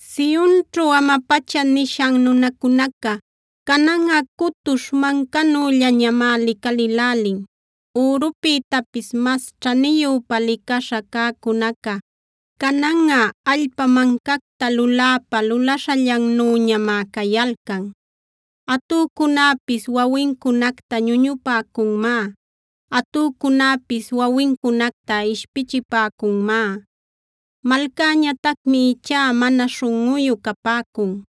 Sionćhu ama-pacha nishan nunacunaca, cananꞌa cutuśh mancanüllañamá licalïlälin. Ürupïtapis mas ćhaniyüpa licaśha cäcunaca, cananꞌa allpa mancacta luläpa lulaśhallannüñamá cayalcan. Atücunäpis wawincunacta ñuñupäcunmá; atücunäpis wawincunacta ishpichipäcunmá. Malcäñatacmi ichá mana śhunꞌuyu capäcun;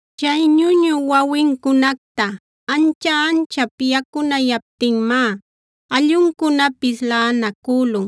Chay ñuñü wawincunacta ancha-anchap yacunayaptinmá alluncunapis laꞌanacülun.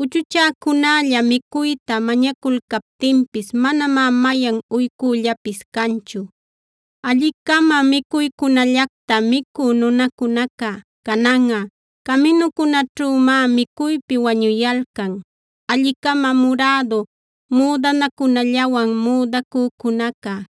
Uchuchäcunälla micuyta mañaculcaptinpis manamá mayan uycüllapis canchu. Alli-cama micuycunallacta micü nunacunaca, cananꞌa caminucunäćhümá micuypi wañuyalcan.b Alli-cama murädu müdanacunallawan müdacücunaca,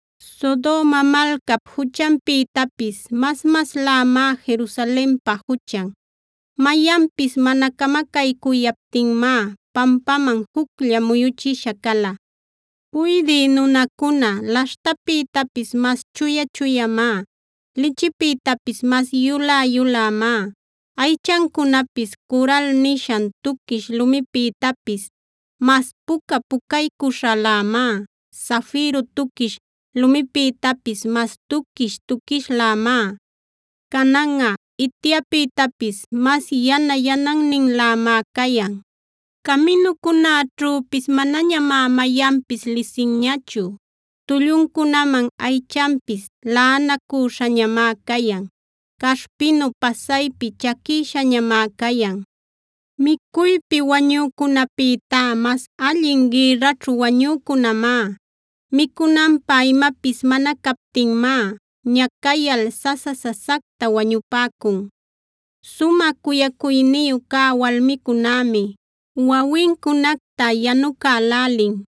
Sodoma malcap juchanpïtapis mas-maslämá Jerusalenpa juchan. Mayanpis mana camacaycuyaptinmá, pampaman juclla muyüchisha cala. Puydï nunancuna laśhtapïtapis mas chuya-chuyamá; lichipïtapis mas yulä-yulämá. Aychancunapis coral nishan tuquish lumipïtapis mas puca-pucaycuśhalämá; zafiro tuquish lumipïtapis mas tuquish-tuquishlämá. Cananꞌa ityapïtapis mas yana-yananninlämá cayan; caminucunäćhüpis manañamá mayanpis lisinñachu. Tulluncunaman aychanpis laꞌanacacüśhañamá cayan; caśhpinu pasaypi chaquïshañamá cayan. Micuypi wañücunäpïtá mas allin gïrraćhu wañücunämá. Micunanpä imapis mana captinmá ñacayal sasa-sasacta wañupäcun. Sumä cuyacuyniyu cä walmicunämi, wawincunacta yanucälälin.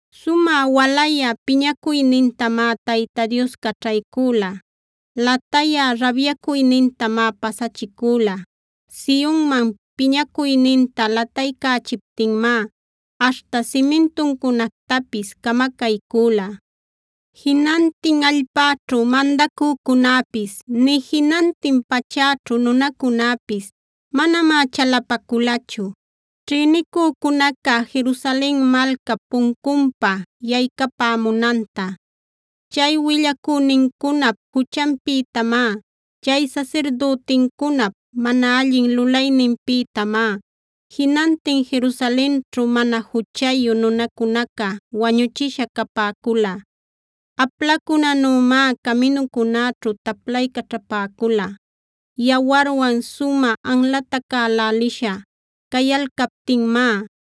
Sumä walayä piñacuynintamá Tayta Dios caćhaycüla; latayä rabyacuynintamá pasachicüla. Sionman piñacuyninta lataycächiptinmá aśhta simintuncunactapis camacaycüla. Jinantin allpäćhu mandacücunäpis, nï jinantin pachäćhu nunacunäpis manamá chalapaculachu, ćhïnicücunaca Jerusalen malcap puncunpa yaycapämunanta. Chay willacünincunap juchanpïtamá, chay sasirdütincunap mana allin lulayninpïtamá, jinantin Jerusalenćhu mana juchayu nunacunaca wañuchisha capäcula. Aplacunänümá caminucunäćhu taplaycaćhapäcula. Yawarwan sumä anlatacälälisha cayalcaptinmá,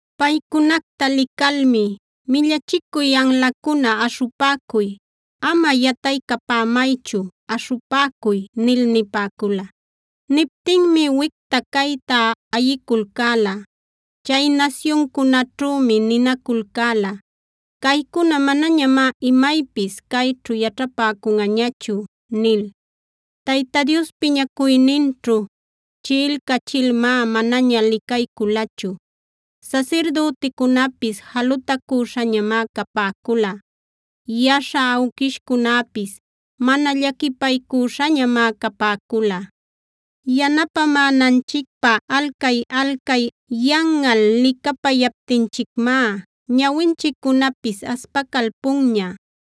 Paycunacta licalmi: “Millachicuy anlacuna; aśhupäcuy. Ama yataycapämaychu; aśhupäcuy” nil nipäcula. Niptinmi wicta cayta ayiculcäla; chay nasyuncunäćhümi ninaculcäla: “Caycuna, manañamá imaypis cayćhu yaćhapäcunꞌañachu” nil. Tayta Dios piñacuyninćhu chiꞌilcachilmá manaña licayculachu; sasirdüticunäpis jalutacüśhañamá capäcula; yaśha awquishcunäpis mana llaquipaycuśhañamá capäcula. Yanapämänanchicpä alcay-alcay yanꞌal licapayaptinchicmá, ñawinchiccunapis aspacalpunña.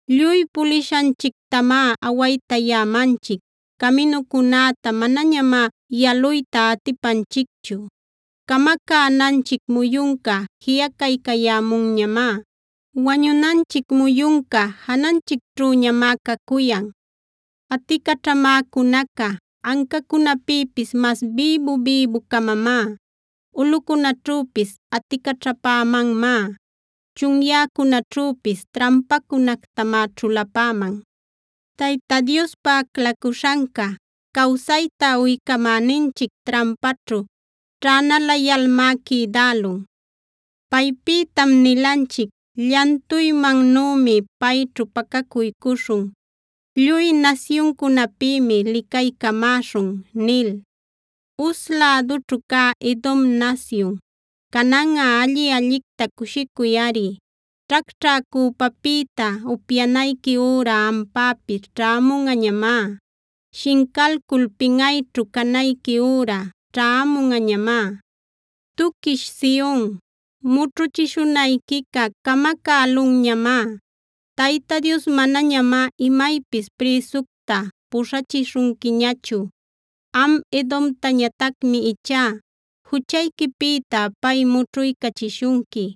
Lluy pulishanchictamá awaytayämanchic; caminucunäta manañamá yaluyta atipanchicchu. Camacänanchic muyunca jiꞌacaycayämunñamá; wañunanchic muyunca jananchicćhüñamá cacuyan; Aticaćhamäcunaca ancacunäpïpis mas bïbu-bïbu-camamá. Ulꞌucunäćhüpis aticaćhapämanmá; chunyäcunäćhüpis trampacunactamá ćhulapäman. Tayta Diospa aclacuśhanca, cawsayta uycamäninchic trampaćhu ćhänalayalmá quïdälun.g Paypïtam nilanchic: “Llantuymannümi payćhu pacacuycuśhun; lluy nasyuncunäpïmi licaycamäśhun” nil. Uz lädućhu cä Edom nasyun, cananꞌa alli-allicta cushicuyꞌari. Ćhacćhä cüpapïta upyanayqui üra ampäpis ćhämunꞌañamá; shincalcul pinꞌayćhu canayqui üra ćhämunꞌañamá. Tuquish Sion, mućhuchishunayquica camacälunñamá;h Tayta Dios manañamá imaypis prïsucta puśhachishunquiñachu. Am Edomtañatacmi ichá juchayquipïta pay mućhuycachishunqui;